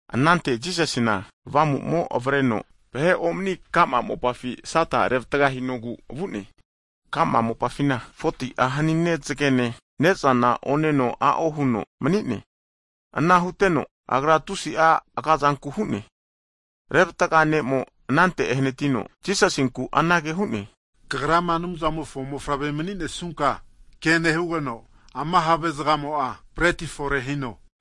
Anante Jisasina Avamu'mo'a avreno vahe omani ka'ma mopafi Sata revatga hinogu vu'ne. Ka'ma kokampi 40'a hanine zagene ne'zana oneno a'o huno mani'ne. Ana huteno Agra tusi'a aga'zanku hu'ne. Revatga hu ne'mo'a anante ehanatino Jisasinku anage hu'ne, Kagrama Anumzamofo mofavre mani'nesunka, ke nehugeno ama have'zagamo'a breti fore hino.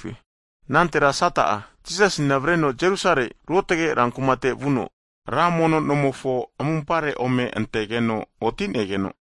Higeno anantetira Sata'a, Jisasina avreno Jerusalemi ruotge rankumate vuno, ra mono nomofo amumpare ome antegeno oti'negeno,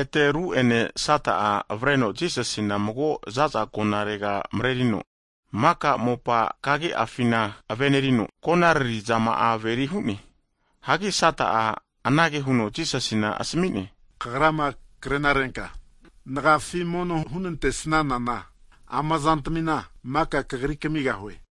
Ete ru'ene Sata'a avreno Jisasina mago za'za agonarega marerino, maka mopa kagi'afima me'nea kumatmimpi me'nea konariri zama'a averi hu'ne. Hagi Sata'a anage huno Jisasina asmi'ne, Kagrama krenarenka nagiafi mono hunantesnanana ama zantamina maka Kagri kamigahue.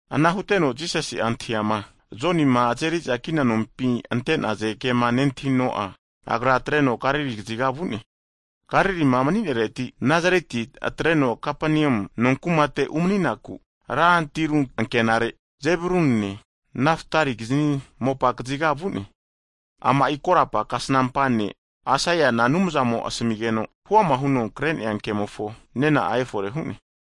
Ana huteno Jisasi'ma antahiama Jonima azeri'za kina nompi ante'naze kema nentahino'a, Agra atreno Galili kaziga vu'ne. Hagi Nazaretia atreno Kapaneamu nonkumate umani'naku ran tiru ankenare, Zebulunine, Nafatalikizni mopa kaziga vu'ne. Ama'i korapa kasnampa ne' Aisaiana Anumzamo asamigeno huama huno kre'nea kemofo nena'a efore hu'ne.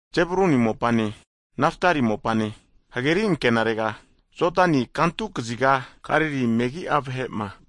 Zebuluni mopane Nafatali mopane, hageri anke'narega, Jodani timofo kantu kaziga, Galili megi'a vahe'ma,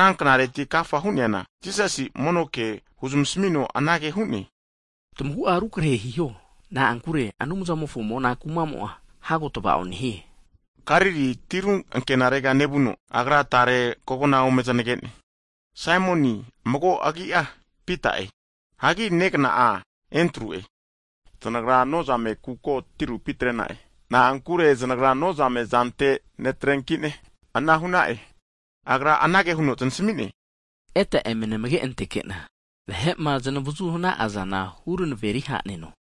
Ana knareti agafa hu'neana, Jisasi'a mono ke huzmasamino anage hu'ne, Tamagu'a rukrahe hiho, na'ankure Anumzamofo mona kuma'mo'a hago tava'o nehie. Galili tiru ankenarega nevuno, Agra tare kogna ome znage'ne, Saimoni'e, mago agi'a Pita'e, hagi negna'a Endru'e. Zanagra nozame kuko tirupi atre'na'e, na'ankure zanagra nozame zante netrenki'ne ana hu'na'e. Agra anage huno zanasmi'ne, Eta eme namage anteke'na, vahe'ma zamavazu hana'azana huranaveri ha'neno.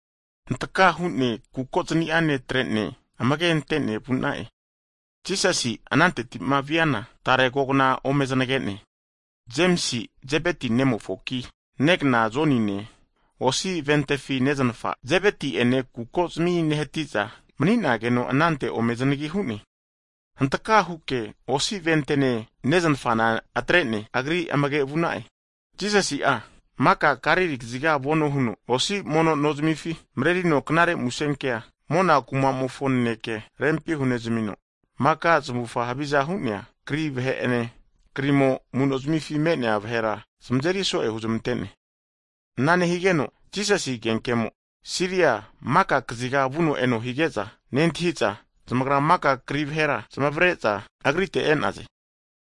Hantaka hu'ne kuko zani'a netre'ne, amage'antene vu'na'e. Jisasi'a ananteti'ma viana, tare kogna ome zanage'ne, Jemsi Zebeti nemofoki, negna Jonine votifi neznafa, Zebeti ene kukozmi nehati'za mani'nageno anante ome zanagi hu'ne. Hantaka huke votifi neznafana atre'ne, Agri amge vu'na'e. Jisasi'a maka Galili kaziga vano nehuno, osi mono nozmifi (sinagog) marerino Knare Musenkea (gospol) mona kuma'mofo naneke rempi hunezmino, maka zamufa haviza hu'nea kri vahe'ene krimo amu'nozmifi me'nea vahera zamazeri so'e huzmante'ne. Ana nehigeno Jisasi agenkemo Siriane maka kaziga vuno eno hige'za, nentahi'za zamagra maka kri vahera zamavare'za Agrite e'naze,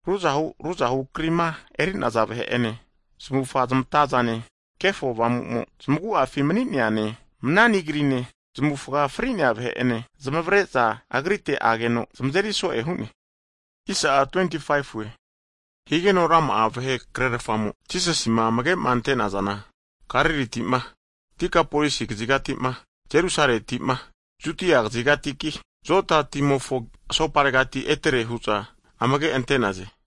ruzahu ruzahu krima eri'naza vahe'ene, zamufa zamatazane, kefo avamu'mo zamagu'afi mani'neane, manani kri'ne, zamufa fri'nea vahe'ene (paralais) zamare'za Agrite ageno zamazeri so'e hu'ne. Ana higeno rama'a vahe krerafamo Jisasima amage ante'nazana, Galiliti'ma, Dekapolisi kazigati'ma, Jerusaleti'ma, Judia kazigatiki, Joda timofo asoparegati etere hu'za amage ante'naze.